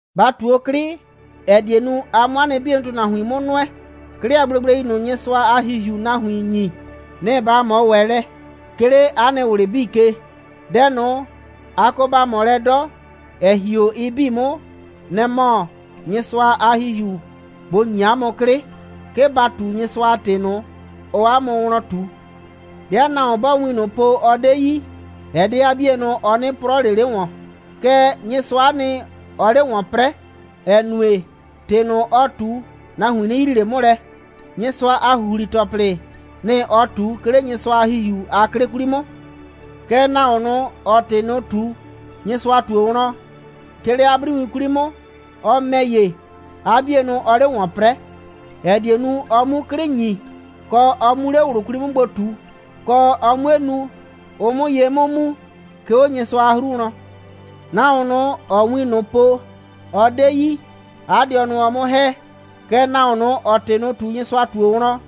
Ba ꞊tu 'o 'klɩ, ‑ɛ die nu, a 'mʋ 'a nɩ 'bienʋ ‑tʋnahuin 'mʋ nʋɛ. 'Klɩ a gblegblei ꞊nʋ, Nyɩsʋa a ‑Hihiuu nahuin ‑nyi, nɩ‑ ba ꞊mɔ ‑wɛ lɛ, 'ke 'le 'a nɩ ꞊wlɩ 'bii ke. Dɛ ꞊nʋ, a kɔ ba ꞊mɔ lɛ 'dɔ, ‑ɛ ‑hi 'o ɩ 'bii 'mʋ, nɛ‑ mɔ Nyɩsʋa a ‑Hihiu bʋ ‑nyi 'a mʋ 'klɩ, 'ke ba ꞊tu Nyɩsʋa a ‑tɩ ꞊nʋ, ɔɔ 'a mʋ wlɔn ꞊tu. 'Bɩa nahuon 'bɔɔ win ꞊nʋ po, ɔ 'de yi, ɛ 'de 'a 'bienʋ, ɔ 'nɩ 'prɔɔ ꞊le 'le ‑wɔn, kɛɛ, Nyɩsʋa'a nɩ, ɔɔ 'le ‑wɔn 'prɛɛ, ‑ɛ nue, ‑tɩ ꞊nʋ, ɔɔ ꞊tu, nahuin 'nɩ yrii ꞊le 'mʋ lɛ, Nyɩsʋa a ‑huhli‑tɔplɩ, nɩ‑ ɔɔ ꞊tu, 'ke 'le Nyɩsʋa a ‑Hihiu a 'klɩ 'kwli 'mʋ. Kɛɛ, nahuon ꞊nʋ, ‑ɔɔ ‑tɩ ꞊nʋ ꞊tu, Nyɩsʋa ꞊tuo wlɔn, 'ke 'le 'a 'briwin 'kwli 'mʋ, ɔ ‑mɛ ‑ye, 'a 'bienʋ ɔɔ 'le ‑wɔn 'prɛɛ, ‑ɛ die nu, ɔ 'mu 'klɩ ‑nyi, kɔ, ɔ 'mu 'le ꞊wlʋ 'kwli 'mʋ gbo ꞊tu, kɔ, ɔ 'mue nu, ʋ 'mʋ ye 'mʋ mu, 'ke 'o Nyɩsʋa a 'hru wlɔn. Nahuon ꞊nʋ, ‑ɔɔ win ꞊nʋ po, ɔ 'de yi, 'a dɩɔnʋ ɔɔ 'mʋ ‑hɛ. Kɛɛ, nahuon ꞊nʋ, ‑ɔɔ ‑tɩ ꞊nʋ ꞊tu, Nyɩsʋa ꞊tuo wlɔn,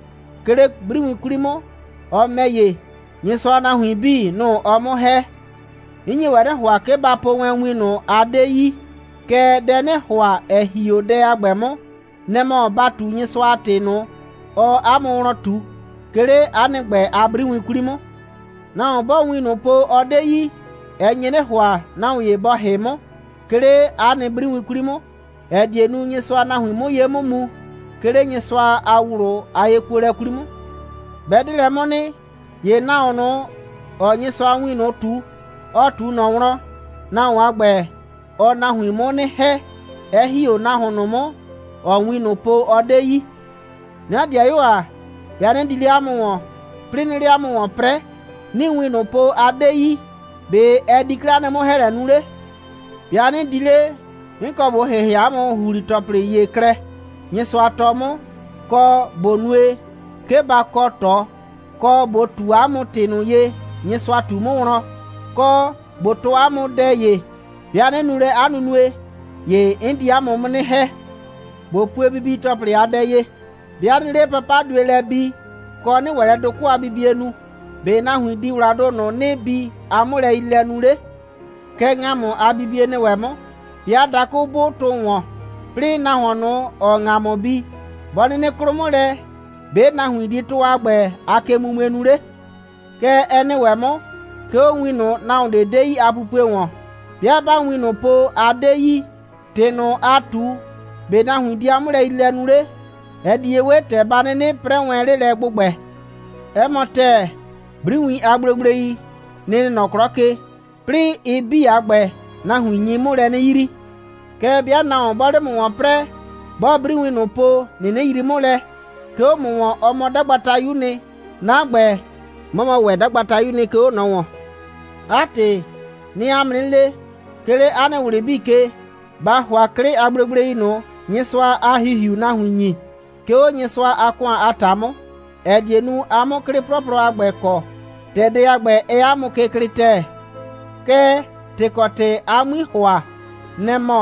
'ke 'le 'briwin 'kwli 'mʋ, ɔ ‑mɛ ‑ye, Nyɩsʋa a nahuin 'bii, nʋ‑ ɔɔ 'mʋ ‑hɛ. 'N nye wɛn 'nɩ ‑hʋa, 'ke a 'bii ba po wɛn win ꞊nʋ, a 'de yi. Kɛɛ, dɛ 'nɩɩ ‑hʋa, ‑ɛ ‑hi 'o dɛ a ‑gbɛ 'mʋ, nɛ‑ mɔ ba ꞊tu Nyɩsʋa a ‑tɩ ꞊nʋ, ɔɔ 'a mʋ wlɔn ꞊tu, 'ke 'le 'a nɩ ‑gbɛ a 'briwin 'kwli 'mʋ. Nahuon 'bɔɔ win ꞊nʋ po, ɔ 'de yi, ɛ nye 'nɩ ‑hʋa, nahuon ‑ye bɔ ‑hɩ 'mʋ, 'ke 'le 'a nɩ 'briwin 'kwli 'mʋ, ‑ɛ die nu, Nyɩsʋa a nahuin 'mʋ ye 'mʋ mu, 'ke 'le Nyɩsʋa a ꞊wlʋ a yekuolɛ 'kwli 'mʋ. 'Bɛ 'de 'lɛ 'mʋ nɩ, ‑ye nahuon ꞊nʋ, ‑ɔɔ Nyɩsʋa a win ꞊nʋ ꞊tu, ɔ ꞊tu ꞊nɔ wlɔn, nahuon a ‑gbɛ, ɔɔ nahuin 'mʋ 'nɩ ‑hɛ, 'ɛ ‑hi 'o nahuon ꞊nʋ 'mʋ, ‑ɔɔ win ꞊nʋ po, ɔ 'de yi. 'Na ‑dɩayuo ‑a, 'bɩa 'nɩ di 'le 'a mʋ ‑wɔn, 'plɩɩ 'nɩɩ 'le 'a mʋ ‑wɔn 'prɛɛ, 'nɩɩ win ꞊nʋ po, a 'de yi, ‑be' ɛ di 'klɛɛ 'a nɩ 'mʋ‑hɛɛlɛ nu 'le? 'Bɩa 'nɩ di 'le, 'n kɔ ꞊bo ‑hɩhɩa 'a mʋ ‑huhli‑tɔplɩ ‑ye klɛ, Nyɩsʋa tɔɔ 'mʋ, kɔ, ꞊bo nue, 'ke ba kɔ ꞊tɔ, kɔ, ꞊bo ꞊tu 'a mʋ ‑tɩ ꞊nʋ ye, Nyɩsʋa ꞊tu 'mʋ wlɔn, kɔ, ꞊bo tɔɔ 'a mʋ dɛ ‑ye. 'Bɩa 'nɩ nu lɛ 'a nunue, ‑ye 'n di 'a mʋ 'mʋ 'nɩ ‑hɛ. ꞊Bo pue bibi‑tɔplɩ a dɛ ye. 'Bɩa ꞊nɩɩ 'le papadue lɛ bi, kɔ, ꞊nɩɩ ‑wɛ lɛ dʋkʋ' a bibie nu, ‑be' nahuin di ‑wladʋ ꞊nʋ, ‑nɩɩ bi 'a 'mʋlɛyriilɛ nu 'le? Kɛ ‑ŋamʋ a bibie nɩ ‑wɛ 'mʋ. 'Bɩa dakʋ 'bʋʋ tʋ ‑wɔn, 'plɩɩ nahuon ꞊nʋ, ‑ɔɔ ‑ŋamʋ bi, 'bɔ 'nɩnɩ 'klʋ 'mʋ lɛ, ‑be' nahuin di tʋ a ‑gbɛ a kemumue nu 'le? Kɛ ɛ nɩ ‑wɛ 'mʋ, 'ke 'o win ꞊nʋ, nahuon 'de yi a pupue ‑wɔn. 'Bɩa 'baa win ꞊nʋ po, a 'de yi, ‑tɩ ꞊nʋ, aa ꞊tu, ‑be' nahuin di 'a 'mʋlɛyriilɛ nu 'le? Ɛ di ye 'we, ‑tɛ ba 'nɩnɩ 'prɛɛ wɛn 'le lɛ ‑gbʋgbɛ. 'Ɛ mɔ ‑tɛɛ, 'briwiin a gblegblei, nɩ‑ nɩ nɔ 'klɔ ke. 'Plɩɩ ɩ 'bii a ‑gbɛ, nahuin nyi 'mʋ lɛ 'nɩ yrii. Kɛɛ, 'bɩa nahuon 'bɔɔ 'le 'mʋ ‑wɔn 'prɛɛ, 'bɔɔ 'briwin ꞊nʋ po, 'nɩnɩ yrii 'mʋ lɛ, 'ke 'o 'mʋ ‑wɔn, ɔ mɔ 'dagbatayu'u nɩ, 'na ‑gbɛ, 'mɔ mɔ ‑wɛ 'dagbatayu'u nɩ, 'ke 'o ꞊nɔ ‑wɔn. 'A ‑tɩ, 'nɩɩ 'a mʋ 'nɩ le, 'ke 'le 'a nɩ ꞊wlɩ 'bii ke, ba ‑hʋa 'klɩ a gblegblei ꞊nʋ, Nyɩsʋa a ‑Hihiuu nahuin ‑nyi, 'ke 'o Nyɩsʋa a ‑kʋan a ‑ta 'mʋ, ‑ɛ die nu, a 'mʋ 'klɩ 'plɔplɔ a ‑gbɛ kɔ, ‑tɛ dɛ a ‑gbɛ, ɛɛ 'a mʋ ke klɩɩ ‑tɛɛ. Kɛɛ, ‑tɩ kɔ ‑tɩ a 'mui ‑hʋa, nɛ‑ mɔ,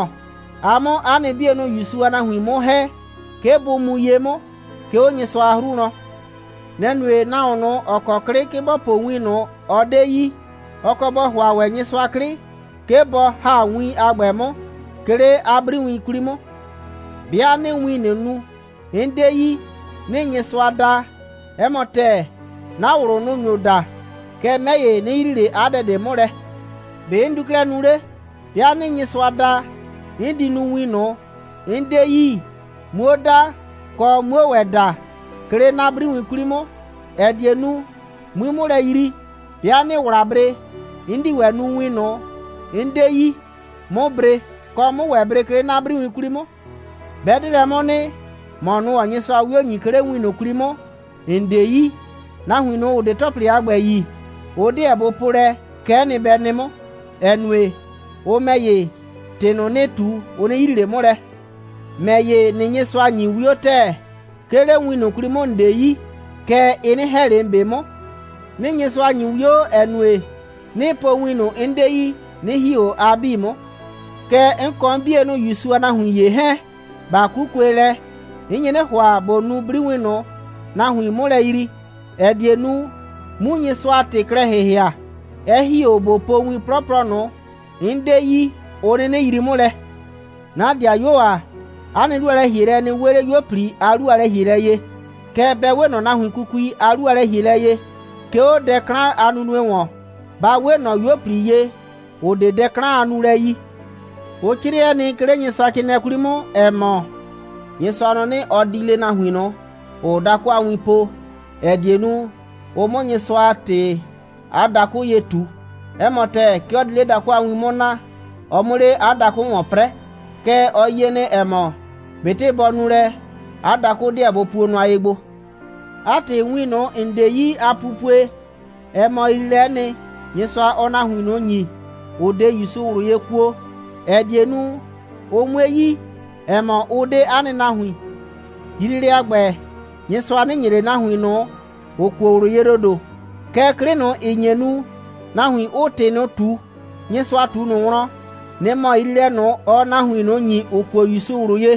a 'mʋ 'a nɩ 'bienʋ ‑Yusu a nahuin 'mʋ ‑hɛ, 'ke bʋ mu ye 'mʋ, 'ke 'o Nyɩsʋa a 'hru wlɔn. Nɛ‑ nue, nahuon ꞊nʋ, ‑ɔ kɔ 'klɩ, 'ke bɔ po win ꞊nʋ, ɔ 'de yi, ɔ kɔ bɔ ‑hʋa ‑wɛ Nyɩsʋa 'klɩ, 'ke bɔ ‑ha win a ‑gbɛ 'mʋ, 'ke 'le 'a 'briwin 'kwli 'mʋ. 'Bɩa 'nɩɩ win ꞊nʋ nu, 'n 'de yi, 'nɩɩ Nyɩsʋa da, 'ɛ mɔ ‑tɛɛ, 'na ꞊wlʋ, nʋ‑ nyo da. Kɛɛ, 'mɛ ‑ye, 'nɩ yrii ꞊le 'a dɛ ꞊de 'mʋ lɛ. ‑Be' 'n di 'klɛɛ nu 'le? 'Bɩa 'nɩɩ Nyɩsʋa da, 'n di nu win ꞊nʋ, 'n 'de yi, 'muo da, kɔ, 'muo ‑wɛ da, 'ke 'le 'na 'briwin 'kwli 'mʋ, ‑ɛ die nu, 'mui 'mʋ lɛ yrii. 'Bɩa 'nɩɩ ‑wla bre, 'n di ‑wɛ nu win ꞊nʋ, 'n 'de yi, 'mʋ bre, kɔ, 'mʋ ‑wɛ bre, 'ke 'le 'na 'briwin 'kwli 'mʋ. 'Bɛ 'de lɛ 'mʋ nɩ, ‑mɔ ꞊nʋ, ‑ɔɔ Nyɩsʋa 'wio ‑nyi, 'ke 'le win ꞊nʋ 'kwli 'mʋ, ‑n 'de yi, nahuin ꞊nʋ, ‑ʋ 'de ‑tɔplɩ a ‑gbɛ yi, ʋ 'deɛ bʋ po lɛ: Kɛ'ɛ nɩ, bɛ nɩ 'mʋ, ‑ɛ nue, ʋ ‑mɛ ‑ye, ‑tɩ ‑nɩɩ ꞊tu, ʋ 'nɩ yrii ꞊le 'mʋ lɛ. ‑Mɛ ‑ye, ‑nɩɩ Nyɩsʋa ‑nyi 'wio ‑tɛɛ, 'ke 'le win ꞊nʋ 'kwli 'mʋ, ‑n 'de yi. Kɛɛ, ɩ 'nɩ ‑hɛ ꞊le ‑n 'be 'mʋ. 'Nɩɩ Nyɩsʋa ‑nyi 'wio, ‑ɛ nue, 'nɩɩ po win ꞊nʋ, 'n 'de yi, 'nɩ ‑hi 'o a 'bii 'mʋ. Kɛɛ, 'n kɔ 'n 'bienʋ ‑Yusu a nahuin ‑ye 'hɛɛn, ꞊ba 'kukue lɛ, 'n nye 'nɩ ‑hʋa, ꞊bo nu 'briwin ꞊nʋ, nahuiin 'mʋ lɛ yrii, ‑ɛ die nu, 'mu Nyɩsʋa a ‑tɩ klɛ ‑hɩhɩa, 'ɛ ‑hi 'o ꞊bo po win 'plɔplɔ ꞊nʋ, 'n 'de yi, ʋ 'nɩnɩ yrii 'mʋ lɛ. 'Na ‑dɩayuo ‑a, 'a nɩ 'lu a lɛ‑hielɛ, ɛ nɩ 'we 'le 'yuo꞊pli a 'lu a lɛ‑hielɛ ye, kɛɛ, bɛ 'we ꞊nɔ nahuin kukui a 'lu a lɛ‑hielɛ ye. 'Ke 'o dɛ 'klan a nunue ‑wɔn, ba 'we ꞊nɔ 'yuo꞊pli ye, ‑ʋ 'de dɛ 'klan a nulɛ yi. Ʋ 'crɩɛ nɩ, 'ke 'le Nyɩsʋacrɩɩnɩɛ 'kwli 'mʋ, ‑ɛ mɔ: «Nyɩsʋa nɔ 'nɩ, ɔ di le nahuin ꞊nʋ, ‑ʋʋ dakʋ a win po, ‑ɛ die nu, ʋ 'mʋ Nyɩsʋa a ‑tɩ 'a dakʋ ye ꞊tu. 'Ɛ mɔ ‑tɛɛ, 'ke ɔ di 'le dakʋ a win 'mʋ naa, ɔ 'mʋ 'le 'a dakʋ ‑wɔn 'prɛɛ. Kɛɛ, ɔ yie nɩ, ‑ɛ mɔ, ꞊betɩ bɔ nu lɛ, 'a dakʋ 'deɛ bʋ puo nʋa ye gbo.» 'A ‑tɩ, win ꞊nʋ, ‑n 'de yi a pupue, ɛ mɔ yriilɛ'ɛ nɩ, Nyɩsʋa, ɔɔ nahuin ꞊nʋ ‑nyi, ‑ʋ 'de ‑Yusu ꞊wlʋ ye kuo, ‑ɛ die nu, ʋ 'mue yi, ‑ɛ mɔ, ʋ 'de 'a nɩ nahuin. Yriilɛ a ‑gbɛ, Nyɩsʋa 'nɩ ‑nye ꞊le nahuin ꞊nʋ, ‑ʋ kuo ꞊wlʋ ye ‑dodo. Kɛɛ, 'klɩ ꞊nʋ, ‑ɩ nye nu, nahuin 'ʋʋ ‑tɩ ꞊nʋ ꞊tu, Nyɩsʋa ꞊tu ꞊nʋ wlɔn, nɩ‑ mɔ yriilɛ ꞊nʋ, ɔɔ nahuin ꞊nʋ ‑nyi, ‑ʋ kuo ‑Yusu ꞊wlʋ ye.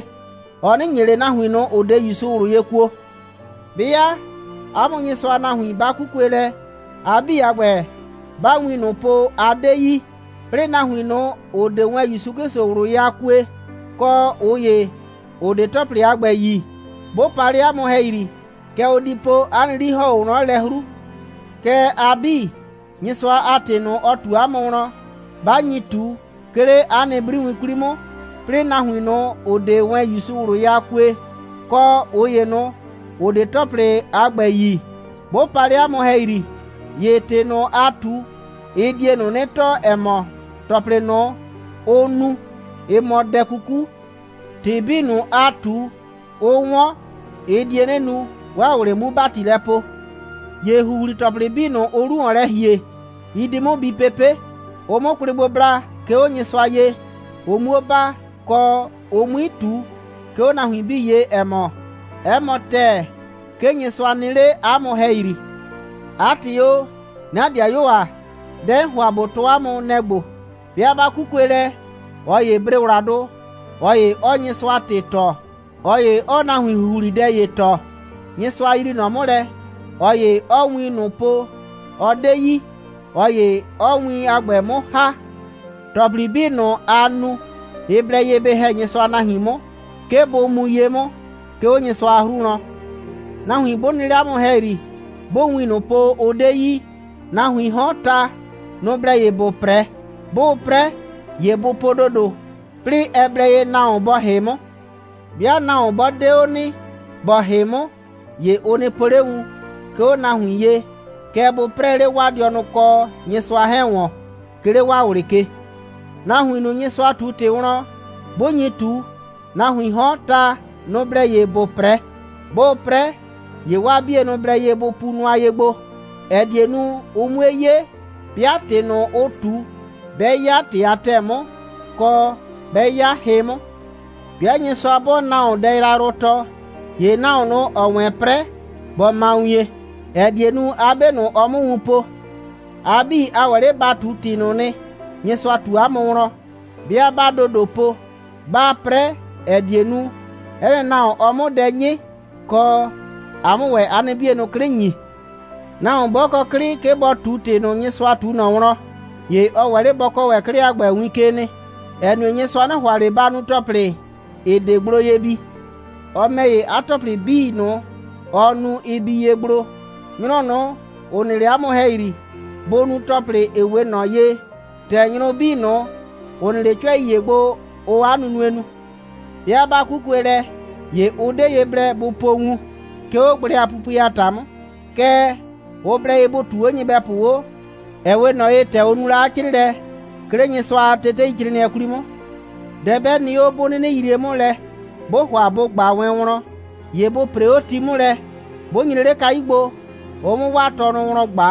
Ɔ 'nɩ ‑nye ꞊le nahuin ꞊nʋ, ‑ʋ 'de ‑Yusu ꞊wlʋ ye kuo. 'Bɩa 'a mʋ Nyɩsʋa a nahuin 'ba 'kukue lɛ, a 'bii a ‑gbɛ, 'baa win ꞊nʋ po, a 'de yi, 'plɩɩ nahuin ꞊nʋ, ‑ʋ 'de wɛn ‑Yusu 'Klɩsʋ ꞊wlʋ ye a kue, kɔ, ꞊ʋ ‑ye, ‑ʋ 'de ‑tɔplɩ a ‑gbɛ yi, 'bʋ pa 'le 'a mʋ ‑hɛyri, kɛ ʋ di po, 'a nɩ 'li ‑hɔn 'o wlɔn lɛ 'hru. Kɛɛ, a 'bii, Nyɩsʋa a ‑tɩ ꞊nʋ, ɔ ꞊tu 'a mʋ wlɔn, 'ba nyi ꞊tu, 'ke 'le 'a nɩ 'briwin 'kwli 'mʋ, 'plɩɩ nahuin ꞊nʋ, ‑ʋ 'de wɛn ‑Yusu ꞊wlʋ ye a kue, kɔ ꞊ʋ ‑ye ꞊nʋ, ‑ʋ 'de ‑tɔplɩ a ‑gbɛ yi, 'bʋ pa 'le 'a mʋ ‑hɛyri, ‑ye ‑tɩ ꞊nʋ, aa ꞊tu, ɩ die ꞊nʋ 'nɩ tɔɔ, ‑ɛ mɔ, ‑tɔplɩ ꞊nʋ, ʋʋ nu, ɩ mɔ dɛ 'kuku. ‑Tɩ 'bii ꞊nʋ, aa ꞊tu, ʋʋ 'wɔn, ɩ die 'nɩ nu, 'waa ꞊wlɩ 'mu ‑bati lɛ poo. ‑Ye ‑huhli‑tɔplɩ 'bii ꞊nʋ, ʋʋ 'lu ‑wɔn lɛ ‑hie, ɩ di 'mʋ bi pepe', ʋ 'mʋ kwlɩ gbo bla, 'ke 'o Nyɩsʋa ye, ʋ 'muo baa, kɔ, ʋ 'mui ꞊tu, 'ke 'o nahuin 'bii ye, ‑ɛ mɔ: «'Ɛ mɔ ‑tɛɛ, 'ke Nyɩsʋa nɩ 'le 'a mʋ ‑hɛyri.» 'A ‑tɩ o, 'na ‑dɩayuo ‑a, dɛ 'n ‑hʋa ꞊bo tɔɔ 'a mʋ, nɛ‑ ‑gbo: 'Bɩa 'ba 'kukue lɛ, ꞊ɔ ‑yee bre ‑wladʋ, ꞊ɔ ‑ye 'ɔɔ Nyɩsʋa a ‑tɩ tɔɔ, ꞊ɔ ‑ye 'ɔɔ nahuin ‑huhlidɛ ‑ye tɔɔ, Nyɩsʋa yrii ꞊nɔ 'mʋ lɛ, ꞊ɔ ‑ye 'ɔɔ win ꞊nʋ po, ɔ 'de yi, ꞊ɔ ‑ye 'ɔɔ win a ‑gbɛ 'mʋ ‑ha. ‑Tɔplɩ 'bii ꞊nʋ, aa nu, ɩ blɛ ye bɩ ‑hɛ Nyɩsʋa a nahuin 'mʋ, 'ke bʋ mu ye 'mʋ, 'ke 'o Nyɩsʋa a 'hru wlɔn. Nahuin 'bʋ nɩ 'le 'a mʋ ‑hɛyri, 'bʋʋ win ꞊nʋ po, ʋ 'de yi, nahuiin 'hɔn ta, nʋ‑ blɛ ye ‑bʋ 'prɛ. 'Bʋʋ 'prɛ, ‑ye bʋ po ‑dodo. 'Plɩɩ ɛ blɛ ye nahuon bɔ ‑hɩ 'mʋ. 'Bɩa nahuon 'bɔ 'de 'o nɩ, ‑bɔ ‑hɩ 'mʋ, ‑ye ʋ nɩ po 'le wun, 'ke 'o nahuin ye, kɛɛ, bʋ 'prɛɛ 'le 'waa dɩɔnʋ kɔ Nyɩsʋa 'hɛɛn ‑wɔn, 'ke 'le 'waa ꞊wlɩ ke. Nahuin ꞊nʋ, Nyɩsʋa ꞊tu ‑tɩ wlɔn, 'bʋ nyi ꞊tu, nahuiin 'hɔn, ta, nʋ‑ blɛ ye ‑bʋ 'prɛ. 'Bʋʋ 'prɛ, ‑ye 'waa 'bienʋ blɛ ye bʋ pu nʋa ye gbo, ‑ɛ die nu, ʋ 'mue 'ye, 'bɩa ‑tɩ ꞊nʋ, ʋʋ ꞊tu, 'bɛ 'ya ‑tɩ a ‑tɛɛ 'mʋ, kɔ, 'bɛ 'ya hɩ 'mʋ. 'Bɩa Nyɩsʋa 'bɔɔ nahuon dɛ yrayrʋ tɔɔ, ‑ye nahuon ꞊nʋ, ‑ɔɔ wɛn 'prɛ, bɔ ma wien, ‑ɛ die nu, 'a 'be ꞊nʋ, ɔ 'mʋ wun po. A 'bii, a ‑wɛ 'le ba ꞊tu ‑tɩ ꞊nʋ nɩ, Nyɩsʋa ꞊tu 'a mʋ wlɔn, 'bɩa 'baa ‑do ‑do po, 'baa 'prɛ, ‑ɛ die nu, 'ɛ nɩ nahuon, ɔ 'mʋ dɛ 'nyɩ, kɔ, a 'mʋ ‑wɛ 'a nɩ 'bienʋ 'klɩ ‑nyi. Nahuon 'bɔ kɔ 'klɩ, 'ke bɔ ꞊tu ‑tɩ ꞊nʋ, Nyɩsʋa ꞊tu ꞊nɔ wlɔn, ‑ye ɔ ‑wɛ 'le bɔ kɔɔ ‑wɛ 'klɩ a ‑gbɛ win ke nɩ, ‑ɛ nue, Nyɩsʋa 'nɩ ‑hʋa ꞊le ‑ba nu ‑tɔplɩ, ‑ɩ 'de gblo ye bi. Ɔ ‑mɛ ‑ye, 'a ‑tɔplɩ 'bii ꞊nʋ, ɔɔ nu, ɩ bi ye gblo. Nyrʋ ꞊nʋ, ‑ʋ nɩ 'le 'a mʋ ‑hɛyri, bʋ nu ‑tɔplɩ, ‑ɩ 'we ꞊nɔ ye, ‑tɛ nyrʋ 'bii ꞊nʋ, ‑ʋ nɩ 'le 'cʋɛi ‑ye gbo, ʋʋ 'a nunue nu. 'Bɩa 'ba 'kukue lɛ, ‑ye ʋ 'de ye blɛ bʋ po wun, ('ke 'o gblɛ a pupue a ‑ta 'mʋ). Kɛɛ, ʋ blɛ ye bʋ ꞊tuu 'o nyɩbɛpʋ 'o, ‑ɛ 'we ꞊nɔ ye, ‑tɛ ʋ nu la 'a 'crɩɩlɛ, 'ke 'le Nyɩsʋa a teteicrɩɩnɩɛ 'kwli 'mʋ. Dɛ 'bɛ nɩ 'o, 'bʋ 'nɩnɩ yrie 'mʋ lɛ, 'bʋʋ ‑hʋa bʋ ꞊gba wɛn wlɔn, ‑ye bʋ ‑pree 'o ti 'mʋ lɛ, 'bʋ nyre 'le kayu gbo, ʋ 'mʋ 'waa tɔnʋ wlɔn ꞊gba.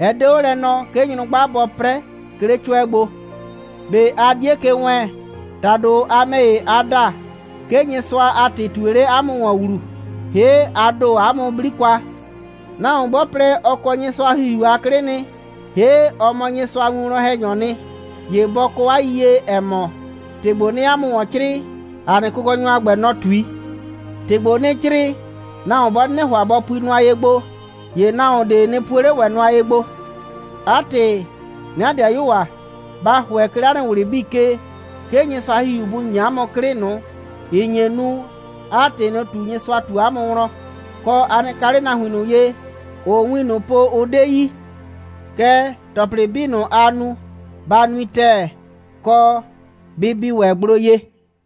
Ɛ 'de 'o lɛ nɔɔ, 'ke nyrʋgba bɔ 'prɛ, 'ke 'le 'cʋɛ gbo. ꞊Be a 'die ke wɛɛn? ‑Tado, a ‑mɛ ‑ye, a da, 'ke Nyɩsʋa a ‑tɩ ꞊tue 'le 'a mʋ ‑wɔn ‑wlu, ‑hee' a ‑do 'a mʋ 'bli kwa. Nahuon 'bɔ plɛ, ɔ kɔ Nyɩsʋa a ‑Hihiu a 'klɩ nɩ, ‑hee' ɔ mɔ Nyɩsʋa a winwlɔn‑hɛnyɔɔ nɩ, ‑ye bɔ kɔ 'a yiyie, ‑ɛ mɔ, ‑tɩ ‑gbo, 'nɩɩ 'a mʋ ‑wɔn 'crɩɩ, ‑a nɩ Kʋkɔnyɔ a ‑gbɛ, nɔ‑ ꞊tui. ‑Tɩ ‑gbo, 'nɩɩ 'crɩɩ, nahuon 'bɔ 'nɩnɩ ‑hʋa bɔ pui nʋa ye gbo, ‑ye nahuon ꞊de nɩ puo 'le ‑wɛ nʋa ye gbo. 'A ‑tɩ, 'na ‑dɩayuo ‑a, ba ‑hʋɛ, 'ke 'le 'a nɩ ꞊wlɩ 'bii ke, 'ke Nyɩsʋa a ‑Hihiu bʋ ‑nyi 'a mʋ 'klɩ ꞊nʋ, ‑ɩ nye nu, 'aa ‑tɩ ꞊nʋ ꞊tu, Nyɩsʋa ꞊tu 'a mʋ wlɔn, kɔ, a nɩ ka 'le nahuin ꞊nʋ ye, ‑ʋʋ win ꞊nʋ po, ʋ 'de yi. Kɛɛ, ‑tɔplɩ 'bii ꞊nʋ, aa nu, ba nui ‑tɛɛ, kɔ, bɩ bi ‑wɛ gblo ye.